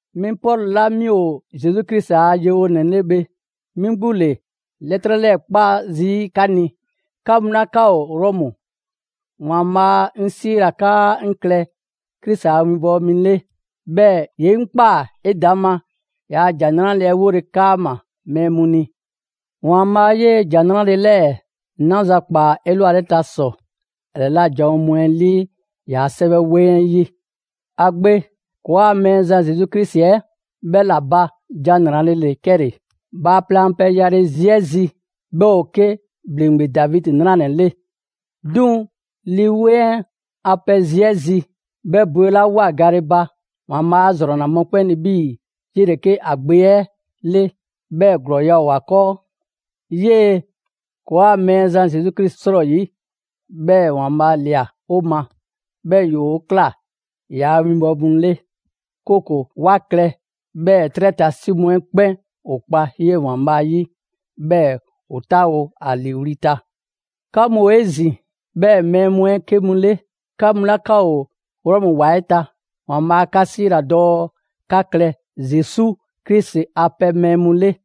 'Mi Pɔlu 'la 'mi ‑o Zesu Krisi a yewonɛ 'le bhe, 'mi 'gbu ‑le 'lɛtrɛ 'lɛɛ‑ 'kpa zii' 'ka ni, 'ka mu 'la 'ka ‑o Rɔmu. ‑Waanbhaa' 'ŋ 'siila‑ 'kaa 'ŋ klɛ Krisi a winbɔwo mi 'le, 'bhɛɛ‑ ‑ye 'ŋ ꞊kpaa 'edaŋma ‑yaa' ‑Jan 'Nrale‑ 'ɛ 'wole‑ 'kaama‑ mɛɛ mu ni. ‑Waanbhaa' 'yee‑ ‑Jan 'Nrale‑ 'lɛɛ‑ 'naza‑ ꞊kpaa 'elwaleta ‑sɔ ‑a 'lɛla‑ janwo mu 'ɛ 'lii ‑yaa' 'Sɛwɛ 'weŋ 'ɛ 'yi. ‑A Gbe, ‑kɔɔa' Mɛɛzan Zesu Krisi 'ɛ, 'bhɛ ‑la ba ‑Jan 'Nrale‑ ‑le 'kɛle‑. Bhaaplɛŋ a pɛ yale zi 'ɛ zi, 'bhɛ ‑o 'ke ‑bhleŋgbe Davidi 'nranɛ‑ 'le. 'Duŋ‑ Lii 'Weŋ 'ɛ a pɛ zi 'ɛ zi, 'bhɛ bwelawoa gale ba, ‑Waanbhaa' 'a ‑zrɔnna mɔkpɛn' ni 'bhii‑ 'yele‑ 'ke ‑a Gbe 'ɛ 'le, 'bhɛɛ‑ ‑glɔɔya' ‑o ‑a 'kɔɔ. 'Yee‑ ‑kɔɔa' Mɛɛzan Zesu Krisi 'srɔyi‑ 'bhɛɛ‑ ‑Waanbhaa' ꞊lia 'o ma, 'bhɛɛ‑ ‑yoo' ꞊kla ‑yaa' winbɔwo mu 'le; 'kooko‑ 'wa klɛ 'bhɛɛ‑ 'trɛ ta 'si mu 'ɛ 'kpɛn ‑o kpa 'yee‑ ‑Waanbhaa' 'yi, 'bhɛɛ‑ ‑o 'taawo‑ ‑a ‑liiwli' ta. 'Ka mu ‑o 'ezin‑ 'bhɛ mɛɛ mu 'ɛ 'ke mu 'le, 'ka mu 'la 'ka ‑o Rɔmu ‑wa 'ɛ ta, ‑Waanbhaa' 'ka 'siila‑ dɔɔ 'ka klɛ Zesu Krisi a pɛ mɛɛ mu 'le.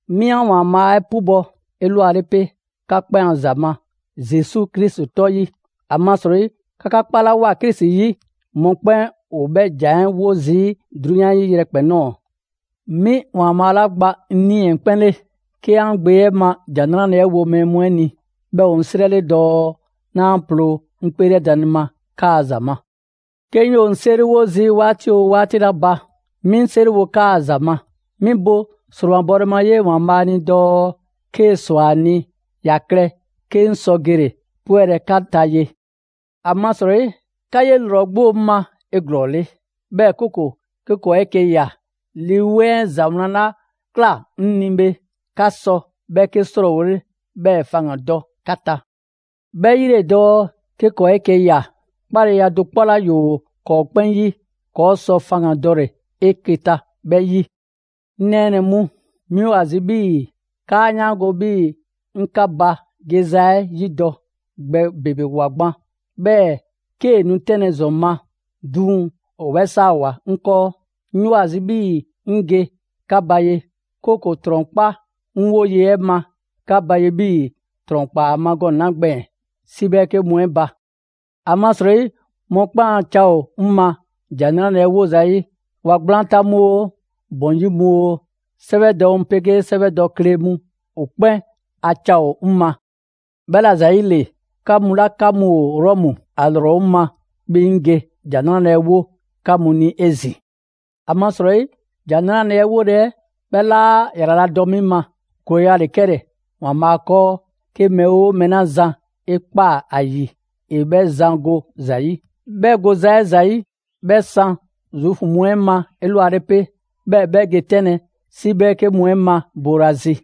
'Mi 'an ‑Waanbhaa' 'ɛ 'pubɔ‑ 'elwale 'pe, 'ka 'kpɛn a ‑za ma Zesu Krisi 'tɔ 'yi; ‑amasrɔyi 'ka 'ka 'kpalawoa Krisi 'yi mɔkpɛn' ‑o 'bhɛ ‑jan 'ɛ 'wo zii' 'drunyan 'ɛ 'yi yrɛkpɛn‑ ꞊nɔɔ. 'Mi ‑Waanbhaa' 'la gba 'ŋ 'nii‑ 'ɛ 'kpɛn 'le, 'ke 'an Gbe 'ɛ ma ‑Jan 'Nrale‑ 'ɛ wo mɛɛ mu 'ɛ ni, 'bhɛ ‑o 'ŋ 'srɛ 'le dɔɔ 'naa ploo 'ŋ 'kpeelɛdanle ma 'kaa‑ ‑za ma. 'Ke 'ŋ 'yoo‑ 'ŋ 'seriwo zii' 'waati 'oo 'waati 'la ba, 'mi 'ŋ 'seriwo 'kaa‑ ‑za ma. 'Mi bo ‑sromabɔle ma 'yee‑ ‑Waanbhaa' ni dɔɔ 'kee‑ ‑swa ‑a ni ‑ya klɛ 'ke 'ŋ sɔ gele‑ 'pwɛlɛ‑ 'ka ta ye. ‑Amasrɔyi 'ka 'ye ‑lrɔ 'gbu ‑o 'ŋ ma 'eglɔɔle, 'bhɛɛ‑ 'kooko‑ 'ke ‑kɔɔ' 'eke‑ ꞊ya, Lii 'Weŋ 'ɛ ‑za 'wlan 'la ꞊kla 'ŋ ni bhe, 'ka sɔ 'bhɛ 'ke 'srɔɔwole, 'bhɛɛ‑ faŋgandɔ 'ka ta. 'Bhɛ 'yi ‑le dɔɔ 'ke ‑kɔɔ' 'eke‑ ‑ya, 'kpaleya do 'kpɔ 'la ‑yoo ‑kɔɔ' 'kpɛn 'yi, ‑kɔɔ' sɔ faŋgandɔle 'eke‑ ta 'bhɛ 'yi. 'Ŋ nɛɛnɛ‑ mu, 'mi ‑o ‑a zi 'bhii‑ 'kaa 'yaango‑ 'bhii‑ 'ŋ 'ka ba geza 'ɛ 'yidɔ‑ gbɛ ‑bebewoa gban; 'bhɛɛ‑ 'kee‑ nu 'tɛnlɛ‑ ‑zɔn ma, 'duŋ‑ ‑o 'bhɛ 'saawoa‑ 'ŋ 'kɔɔ. 'Ŋ 'yoo‑ ‑a zi 'bhii‑ 'ŋ ge 'ka ba ye, 'kooko‑ ‑trɔn kpa 'ŋ 'woye‑ 'ɛ ma 'ka ba ye 'bhii‑ ‑trɔn ꞊kpaa ‑a ma gɔnɛ‑ 'la gbɛɛn‑ 'si 'bhɛɛke mu 'ɛ ba. ‑Amasrɔyi mɔkpɛn' a ca ‑o 'ŋ ma ‑Jan 'Nrale‑ 'ɛ 'wo zayi': ‑wa ‑gblaan ta mu oo, ‑bɔn 'yi mu oo, 'sɛwɛdɔ mu 'pegee 'sɛwɛdɔ kle mu, ‑o 'kpɛn a ca ‑o 'ŋ ma. 'Bhɛla‑ ‑zayile, 'ka mu 'la 'ka mu ‑o Rɔmu, ‑a ‑lrɔ ‑o 'ŋ ma 'bhii‑ 'ŋ ge ‑Jan 'Nrale‑ 'ɛ 'wo 'ka mu ni 'ezin‑. ‑Amasrɔyi, ‑Jan 'Nrale‑ 'ɛ 'wole‑ 'ɛ, 'bhɛ 'laa ‑yraladɔ 'mi ma. ‑Glɔɔya' ‑le 'kɛle‑ ‑Waanbhaa' 'kɔɔ 'ke mɛɛ 'oo mɛɛ 'la zan 'e ꞊kpaa ‑a ‑yi ‑e 'bhɛ zan go ‑za 'yi. 'Bhɛ goza 'ɛ ‑za 'yi, 'bhɛ san Zuufu mu 'ɛ ma 'elwale 'pe, 'bhɛɛ‑ 'bhɛ ge 'tɛnlɛ‑ 'si 'bhɛɛke mu 'ɛ ma boolazi.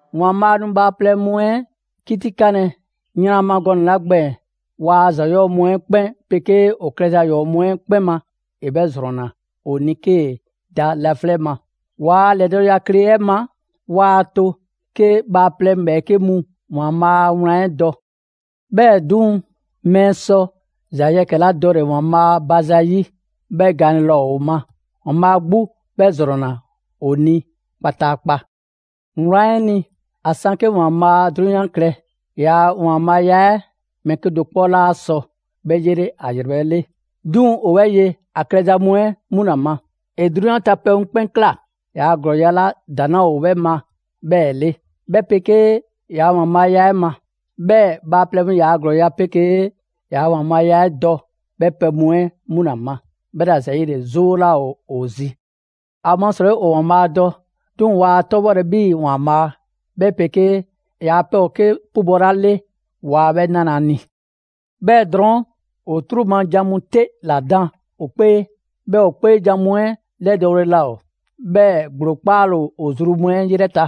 ‑Waanbhaa' nu bhaaplɛŋ mu 'ɛ 'kitikanlɛ yran ma gɔnɛ‑ 'la gbɛɛn‑ waa ‑za 'yɔɔ‑ mu 'ɛ 'kpɛn 'pegee ‑o klɛza ‑yɔɔ' mu 'ɛ 'kpɛn ma, ‑e 'bhɛ ‑zrɔnna ‑o ni 'kee‑ da laflɛ' ma. Waa ‑lɛdɔɔkleya 'ɛ ma, waa to 'ke bhaaplɛŋ ‑bhɛɛke' mu ‑Waanbhaa' a wlan 'ɛ dɔ. 'Bhɛɛ‑ 'duŋ‑, mɛɛ sɔ ‑za yɛkɛ‑ 'la dɔle‑ ‑Waanbhaa' ba zayi', 'bhɛ gaanle laa ‑o ma; ‑Waanbhaa' 'gbu 'bhɛ ‑zrɔnna ‑o ni kpataakpa. Wlan 'ɛ ni, ‑a 'san 'ke ‑Waanbhaa' 'drunyan klɛ, ‑yaa' ‑Waanbhaaya 'ɛ, mɛɛ 'kedo‑ 'kpɔ laa sɔ 'bhɛ 'yele ‑a ‑yrɛbhɛ' 'le; 'duŋ‑ 'o 'bhɛ ye ‑a klɛza mu 'ɛ 'mu ‑la ma. ‑E 'drunyan ta pɛ mu 'kpɛn ꞊kla ‑yaa' ‑glɔɔya' 'la ‑daŋ' 'laa ‑o 'bhɛ ma 'bhɛɛ‑ 'le, 'bhɛ 'pegee ‑yaa' ‑Waanbhaaya 'ɛ ma. 'Bhɛɛ‑ ‑bhaaplɛŋ ‑yaa' ‑glɔɔya' 'pegee ‑yaa' ‑Waanbhaaya 'ɛ dɔ 'bhɛ pɛ mu 'ɛ 'mu ‑la ma. 'Bhɛla‑ ‑yile 'zoo 'laa ‑o ‑o zi. ‑Amasrɔyi ‑o ‑Waanbhaa' dɔ, 'duŋ‑ waa 'tɔbhɔlɛ 'bhii‑ ‑Waanbhaa', 'bhɛ 'pegee ‑yaa' pɛ ‑o 'ke 'pubɔ‑ 'la 'le, waa 'bhɛ 'nalɛ‑ ‑a ni. 'Bhɛɛ‑ drɔɔn', ‑o 'truu‑ ma jan mu 'te ‑la dan ‑o 'kpee, 'bhɛɛ‑ ‑o 'kpeejan‑ mu 'ɛ 'lɛdɔɔle laa ‑o, 'bhɛɛ‑ ‑gblo 'kpale‑ ‑o zru mu 'ɛ 'yrɛ ta.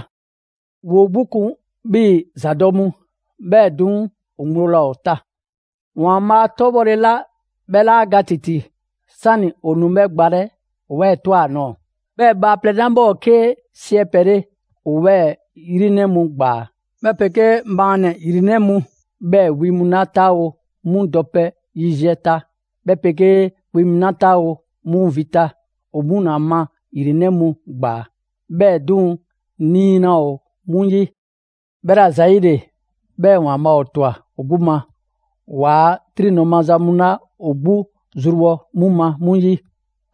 ‑Woo 'gbu kun 'bhii‑ ‑zadɔ' mu, 'bhɛɛ‑ 'duŋ‑ ‑o ŋgblo laa ‑o ta. ‑Waanbhaa' 'tɔbhɔle 'la 'bhɛ 'laa ga ‑titi, 'sani‑ ‑o nu 'bhɛ gbalɛ, ‑o 'bhɛ ꞊twa ‑a nɔɔ‑, 'bhɛɛ‑ bhaaplɛŋ 'la 'bhɛ ‑o 'ke 'siɛpɛ‑ 'le, ‑o 'bhɛɛ‑ ‑yrinɛ' mu ‑gbaa, 'bhɛ 'pegee maannɛ‑ ‑yrinɛ' mu, 'bhɛɛ‑ wi mu 'la 'taawo‑ 'mu dɔpɛ yiziɛ ta, 'bhɛ 'pegee wi mu 'la 'taawo‑ 'mu vi ta, ‑o 'mu ‑la ma ‑yrinɛ' mu ‑gbaa; 'bhɛɛ‑ 'duŋ‑ 'nii‑ 'laa ‑o 'mu 'yi. 'Bhɛla‑ ‑zayile, 'bhɛɛ‑ ‑Waanbhaa' ‑o ꞊twa ‑o 'gbu ma, ‑waa' 'triŋdɔ‑ maza mu 'la ‑o 'gbu zrubhɔ 'mu ma 'mu 'yi.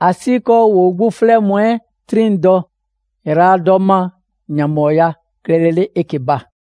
‑Asiikɔɔ ‑woo 'gbu 'flɛ mu 'ɛ 'triŋdɔ‑ ‑yraladɔ ma ‑yanbhɔɔya klɛlele 'eke‑ ba.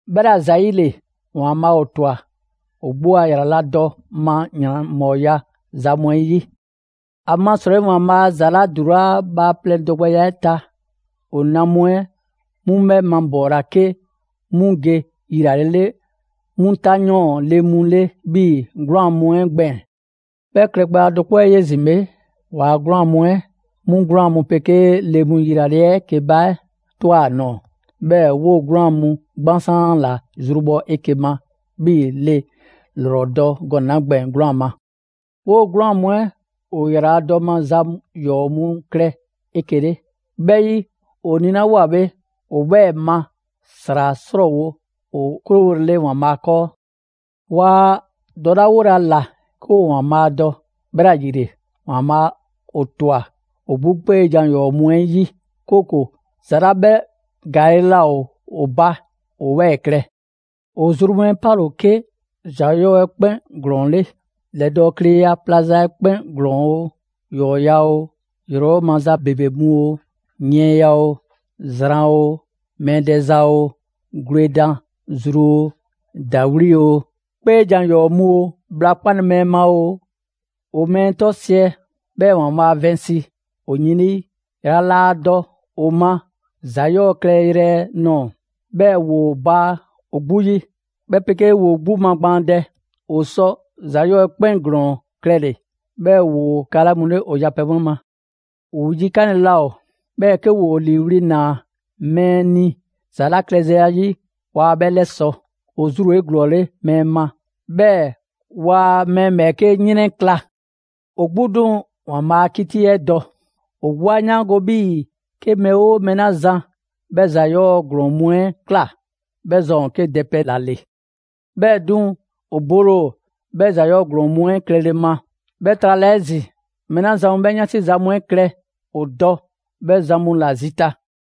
'Bhɛla‑ ‑zayile, ‑Waanbhaa' ‑o ꞊twa ‑o 'gbu a ‑yraladɔ ma ‑yanbhɔɔya ‑za mu 'ɛ 'yi. ‑Amasrɔyi, ‑Waanbhaa' ‑za 'la ‑dulaa' bhaaplɛŋ dɔgbɛya 'ɛ ta, ‑o na mu 'ɛ 'mu 'bhɛ mabɔɔla 'ke 'mu ge yilale 'mu 'tanyɔɔn le mu 'le 'bhii‑ 'gwlaan‑ mu 'ɛ gbɛɛn‑. 'Bhɛ klɛgbɛya do 'kpɔ 'ɛ 'yi 'ezin‑ bhe, ‑waa' 'gwlaan‑ mu 'ɛ, 'mu 'gwlaan‑ mu 'pegee le mu yilale 'ɛ 'eke‑ ba 'ɛ ꞊twa ‑a nɔɔ‑, 'bhɛɛ‑ 'woo‑ 'gwlaan‑ mu 'gbansaan ‑la zrubhɔ 'eke‑ ma 'bhii‑ le ‑lrɔ dɔ gɔnɛ‑ 'la gbɛɛn‑ 'gwlaan‑ ma. 'Woo‑ 'gwlaan‑ mu 'ɛ ‑o ‑yraladɔ ma ‑za 'yɔɔ‑ mu klɛ 'eke‑ 'le. 'Bhɛ 'yi, ‑o nilawoa bhe, ‑o 'bhɛɛ‑ ma ‑sra 'srɔɔwo‑ ‑o 'krowolele ‑Waanbhaa' 'kɔɔ. Waa dɔlawolɛ ‑a ‑la 'ke ‑o ‑Waanbhaa' dɔ, 'bhɛla‑ ‑yile, ‑Waanbhaa' ‑o ꞊twa ‑o 'gbu 'kpeejan‑ ‑yɔɔ' mu 'ɛ 'yi; 'kooko‑ ‑za 'la 'bhɛ ‑gaale' laa ‑o ba ‑o 'bhɛɛ‑ klɛ. ‑O zru mu 'ɛ 'pale‑ ‑o 'ke ‑za 'yɔɔ‑ 'ɛ 'kpɛn ‑glɔɔn 'le: ‑lɛdɔɔkleya plaza 'ɛ 'kpɛn ‑glɔɔn oo, ‑yɔɔya' oo, ‑yrɛbhɔ' maza ‑bebe mu oo, yiɛnya oo, zran oo, mɛɛ dɛza oo, gwledan zru oo, ‑dawli' oo, 'kpeejan‑ ‑yɔɔ' mu oo, bhla 'kpale‑ mɛɛ ma oo; ‑o mɛɛ 'tɔsiɛ‑, bhɛɛ‑ ‑Waanbhaa' vɛnsi ‑o yin 'lii, ‑yrala' laa dɔ ‑o ma ‑za 'yɔɔ‑ klɛ yrɛ nɔɔ‑; 'bhɛɛ‑ ‑woo baa ‑o 'gbu 'yi, 'bhɛ 'pegee ‑woo 'gbu magbaandɛ; ‑o sɔ ‑za 'yɔɔ‑ 'ɛ 'kpɛn ‑glɔɔn klɛle‑, 'bhɛɛ‑ ‑woo ‑kala' mu 'le ‑o yapɛ mu 'ɛ ma. ‑O yikanle 'laa ‑o, 'bhɛɛ‑ 'ke ‑woo ‑liiwli' ‑naa mɛɛ ni ‑za 'la klɛ zayi', waa 'bhɛ 'lɛsɔ‑; ‑o zru ‑o 'eglɔɔle mɛɛ ma, 'bhɛɛ‑ waa mɛɛ ‑bhɛɛke' 'yrɛnkla‑. ‑O 'gbu 'duŋ‑ ‑Waanbhaa' a 'kiti 'ɛ dɔ: ‑o 'gbu 'a 'yaango‑ 'bhii‑ 'ke mɛɛ 'oo mɛɛ 'la zan 'bhɛ ‑za 'yɔɔ‑ ‑glɔɔn mu 'ɛ ꞊kla, 'bhɛ zan ‑o 'ke dɛpɛ ‑la ‑le. 'Bhɛɛ‑ 'duŋ‑, ‑o bole ‑o 'bhɛ ‑za 'yɔɔ‑ ‑glɔɔn mu 'ɛ klɛle ma. 'Bhɛ trala 'ezin‑, mɛɛ 'la zan mu 'bhɛ 'yansi za mu 'ɛ klɛ, ‑o dɔ 'bhɛ zan mu ‑la zita.